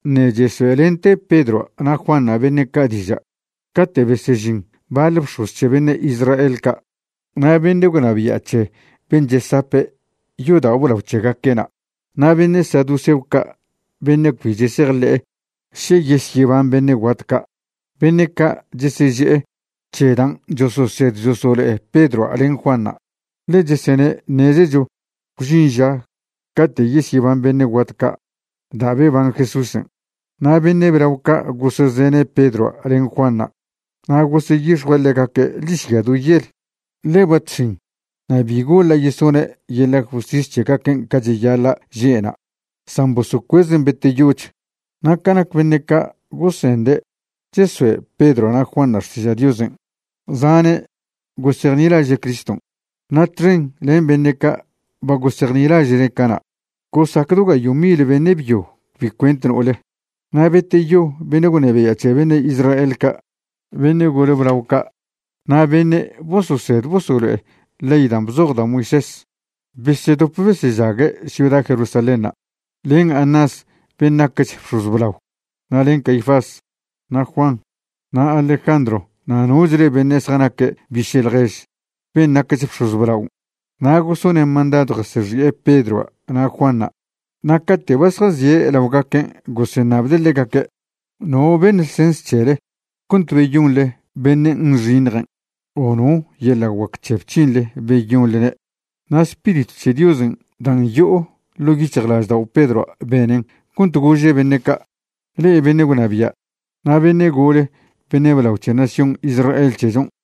Ṉe' chesoe'lente Pedroa' na' Juanṉa' beṉe' ca' diža' cate' besežin baḻ bx̱oz c̱he beṉe' Israel ca', na' beṉe' gwnabia' c̱he ben' chesape' yodao' blao c̱hegaque'na' na' beṉe' saduceo ca' beṉe' cbi chesejḻe'e še yesyeban beṉe' guat ca'. Beṉe' ca' cheseže'e c̱he dan' chososed chosolo'e Pedroa' len Juanṉa', ḻe chesene' ṉezecho gwžin ža cate' yesyeban beṉe' guat ca' da' beban Jesúsen'. Na' beṉe' blao ca' gosezene' Pedroa' len Juanṉa' na' goseyix̱jue' ḻegaque' ḻižya do yel, ḻe ba chx̱in na' bi goḻa' yesone' yeḻa' justis c̱hegaquen' ca cheyaḻa' že'na', san bosocuezen' beteyoch. Na' ca nac beṉe' ca' gosende' chesoe' Pedroa' na' Juanṉa' xtiža' Diosen', zane' gosejnilaže' Criston', na' txen len beṉe' ca' ba gosejnilaže'ne' cana', gosac do gayo' mil beṉe' byo cbi cuent no'ole. Na' beteyo beṉe' gwnabia' c̱he beṉe' Israel ca', beṉe' gole blao ca' na' beṉe' bososed bosolo'e ley dan' bzoj da' Moisés, besedop besežague' ciuda Jerusalénṉa' len Anás ben' naquech bx̱oz blao, na' len Caifás, na' Juan, na' Alejandro na' nochle beṉe' zjanaque' biše' ḻjež ben' naquech bx̱oz blaon'. Na' gosone' mandadw jasexi'e Pedroa' na' Juanṉa' na' cate' ba zjazie' laogaquen' goseṉabde' ḻegaque': ―¿No beṉ ḻsens c̱hele cont beyonḻe beṉe' nxiṉjen'? o ¿no yeḻa' guac c̱he bc̱hinḻe beyonḻene'? Na' Spiritw che Diosen' dan' yo'o ḻo' yic̱hjlaždao' Pedroa' benen cont gože' beṉe' ca': ―Le'e beṉe' gwnabia' na' beṉe' gole beṉe' blao c̱he nación Israel c̱hechon',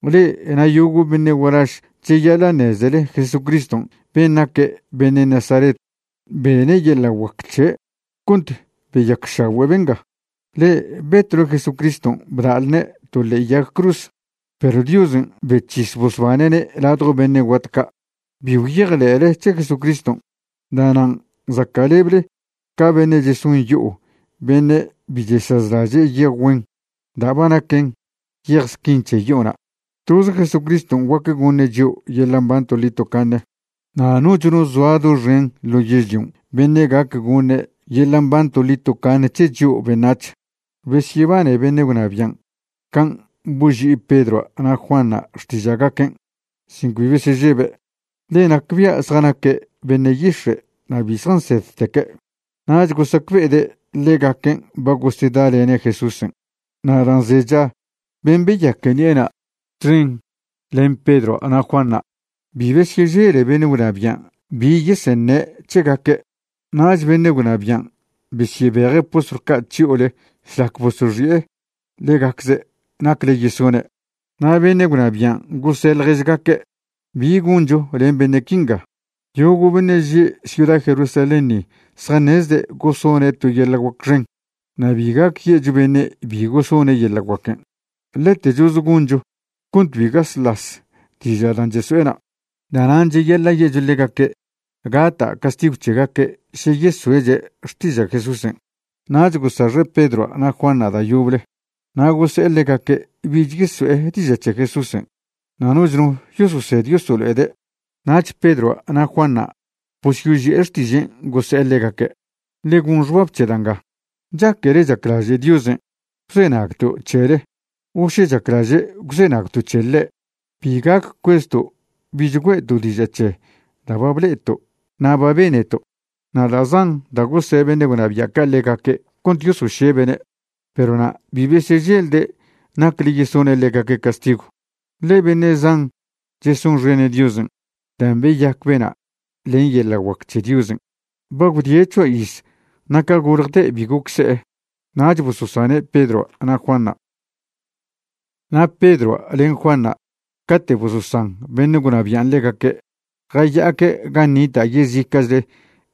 Le'e na' yogo' beṉe' gualaž cheyaḻa' ṉezele Jesucriston' ben' naque' beṉe' Nazaret bene' yeḻa' guac c̱he' cont beyacšagüe' benga. Le'e betwle Jesucriston' bda'lne' to ḻe'e yag cruz, perw Diosen' bec̱his bosbane'ne' ladjo beṉe' guat ca'. Bi gwyejḻe'le c̱he Jesucriston', da'nan' zaca'leble ca beṉe' cheson yo'o beṉe' bi chesazlaže' yej güen da' ba naquen yej squin c̱he yo'ona'. Toze Jesucriston' guac goṉe' chio' yeḻa' mban toḻi tocaṉe, na' noch no zoa doxen ḻo yežlion' beṉe' gac goṉe' yeḻa' mban toḻi tocaṉe c̱he chio' beṉac̱h. Besyebane beṉe' gwnabian' can' boži'i Pedroa' na' Juanṉa' xtiža'gaquen' sin cbi besežebe', ḻe nacbia' zjanaque' beṉe' yix̱e' na' bi zjansedteque'. Nach gosacbe'ede' ḻegaquen' ba gosedalene' Jesúsen'. Na' dan' zecha ben' beyaque ṉi'ena' txen len Pedroa' na' Juanṉa', bi besyežele beṉe' gwnabian' bi yeseṉe' c̱hegaque'. Nach beṉe' gwnabian' besyebeje' postlw ca' chyo'ole šlac bosoxi'e ḻegacze' nacle yesone'. Na' beṉe' gwnabian' gose' ḻježgaque': ―¿Bi goncho len beṉe' quinga? Yogo' beṉe' že' ciuda Jerusalén ni zjaṉezde' gosone' to yeḻa' guac xen na' bi gac ye'cho beṉe' bi gosone' yeḻa' guaquen'. Ḻetechoze goncho cont cbi gaslas diža' dan' cheso'ena'. Da'nan' cheyaḻa' ye'cho ḻegaque' gata' castigw c̱hegaque' še yesoe'che' xtiža' Jesúsen'. Nach gosaxe' Pedroa' na' Juanṉa' da' yoble na' gose'e ḻegaque' bich yeso'e diža' c̱he Jesúsen' na' noch no yososed yosolo'ede'. Nach Pedroa' na' Juanṉa' bosyoži'e xtižen' gose'e ḻegaque': ―Ḻe gon xbab c̱he da' nga, ¿chaquele chaclaže' Diosen' gwzenagto' c̱hele o še chaclaže' gwzenagto' c̱he ḻe'? Bi gac cuezto' bich güe'to' diža' c̱he da' ba ble'eto' na' ba beneto'. Na' da' zan da' gose' beṉe' gwnabia' ca' ḻegaque' cont yosošebe'ne'. Perw na' bi beseželde' nacle yesone' ḻegaque' castigw, ḻe beṉe' zan chesonxene' Diosen' dan' beyac bena' len yeḻa' guac c̱he Diosen'. Ba gwdie' c̱hoa iz na' ca goljte' bi goc se'e. Nach bososane' Pedroa' na' Juanṉa'. Na' Pedroa' len Juanṉa' cate' bososan beṉe' gwnabian' ḻegaque' jaya'aque' gan' nita' yezica'chle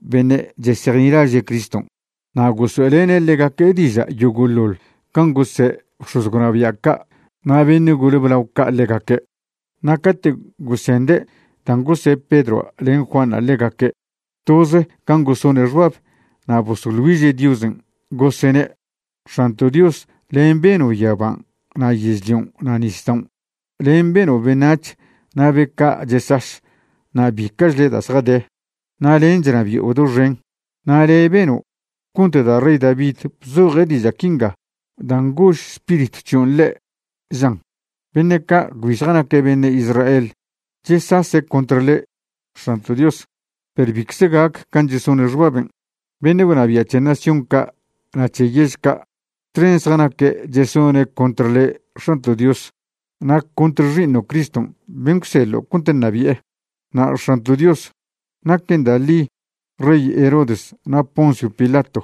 beṉe' chesejnilaže' Criston' na' gosoe'lene' ḻegaque' diža' yogo'ḻoḻ can' gose' bx̱oz gwnabia' ca' na' beṉe' gole blao ca' ḻegaque'. Na' cate' gosende' dan' gose' Pedroa' len Juanṉa' ḻegaque', toze can' gosone' xbab na' bosoḻ güiže' Diosen', gosene': ―X̱anto' Dios, len' beno' yaban' na' yežlion' na' nisdaon'. Len' beno' beṉac̱h na' be ca' chesaš na' bica'chle da' zjade, na' len' chnabi'o doxen. Na' le' beno' cont da' rey David bzoje' diža' quinga dan' gož Spiritw c̱hion' ḻe', žan: Beṉe' ca' cbi zjanaque' beṉe' Israel chesase' contr le', X̱anto' Dios, perw bicze gac can' chesone' xbaben'. Beṉe' gwnabia' c̱he nación ca' na' c̱he yež ca' txen zjanaque' chesone' contr le' X̱anto' Dios, na' contr Xi'iṉo' Criston' ben' gwseḻo' cont ṉabi'e. ’Na' X̱anto' Dios, naquen da' ḻi rey Herodes na' Poncio Pilato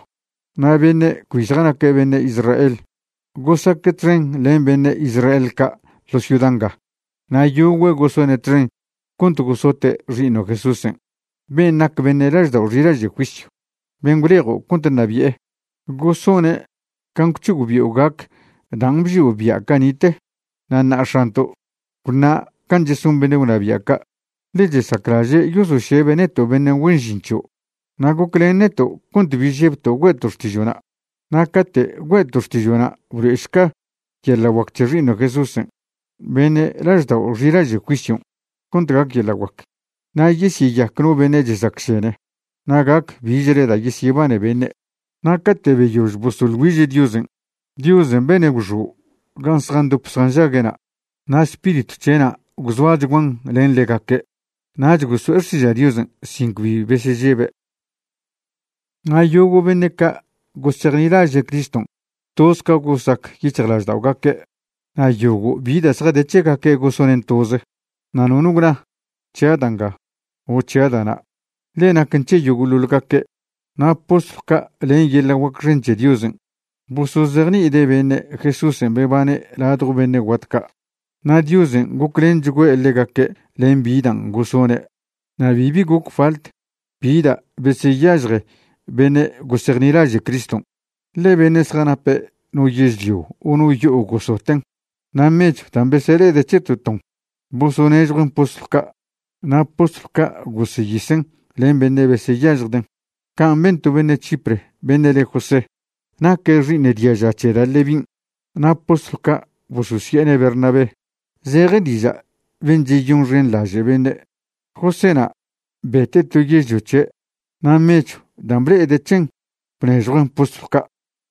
na' beṉe' cbi zjanaque' beṉe' Israel gosaque' txen len beṉe' Israel ca' ḻo ciuda nga. Na' yogüe' gosone' txen cont gosote' Xi'iṉo' Jesúsen' ben' nac beṉe' laždao' xilaže' juisyw, ben' gwlejo' cont ṉabi'e. Gosone' can' gwc̱hogbi'o gac dan' bžio' bia' cani'te. Na' ṉa'a X̱anto', gwṉa can' cheson beṉe' gwnabia' ca', ḻe chesaclaže' yosošebe' neto' beṉe' güen žin c̱hio'. Na' goclen neto' cont bi žebto' güe'to' xtižo'na'. Na' cate' güe'to' xtižo'na' blo'ešca yeḻa' guac c̱he Xi'iṉo' Jesúsen' beṉe' laždao' xilaže' juisyon' cont gac yeḻa' guac, na' yesyeyac no beṉe' chesacšene na' gac bichle da' yesyebane beṉe'. Na' cate' beyož bosoḻ güiže' Diosen', Diosen' bene' gwxo' gan' zjandop zjanžague'na' na' Spiritw c̱he'na' gwzoachguan len ḻegaque', nach goso'e xtiža' Diosen' sin cbi besežebe'. Na' yogo' beṉe' ca' gosejnilaže' Criston' toz ca gosac yic̱hjlažda'ogaque'. Na' yogo' bi da' zjade c̱hegaque' gosonen' toze, na' nono gwna: “C̱hia' da' nga”, o “C̱hia' da' na'”, ḻe naquen c̱he yogo'ḻoḻ gaque'. Na' postlw ca' len yeḻa' guac xen c̱he Diosen' bosozejni'ide' beṉe' Jesúsen' bebane' ladjo beṉe' guat ca'. Na' Diosen' goclenchgüe' ḻegaque' len bi dan' gosone'. Na' bibi goc falt bi da' beseyažje beṉe' gosejnilaže' Criston', ḻe beṉe' zjanape' no yežlio o no yo'o gosoten'. Na' mechw dan' besele'ede' c̱he to ton bosonežjuen' postlw ca', na' postlw ca' goseyisen' len beṉe' beseyažjden'. Can' ben to beṉe' Chipre beṉe' le José. Naque' xi'iṉ diaža c̱he da' Levin' na' postlw ca' bososi'ene' Bernabé, zeje diža' ben' cheyonxenḻaže' beṉe'. Joséna' bete' to yežlio c̱he' na' mechw dan' ble'ede' c̱hen bnežjuen' postlw ca'.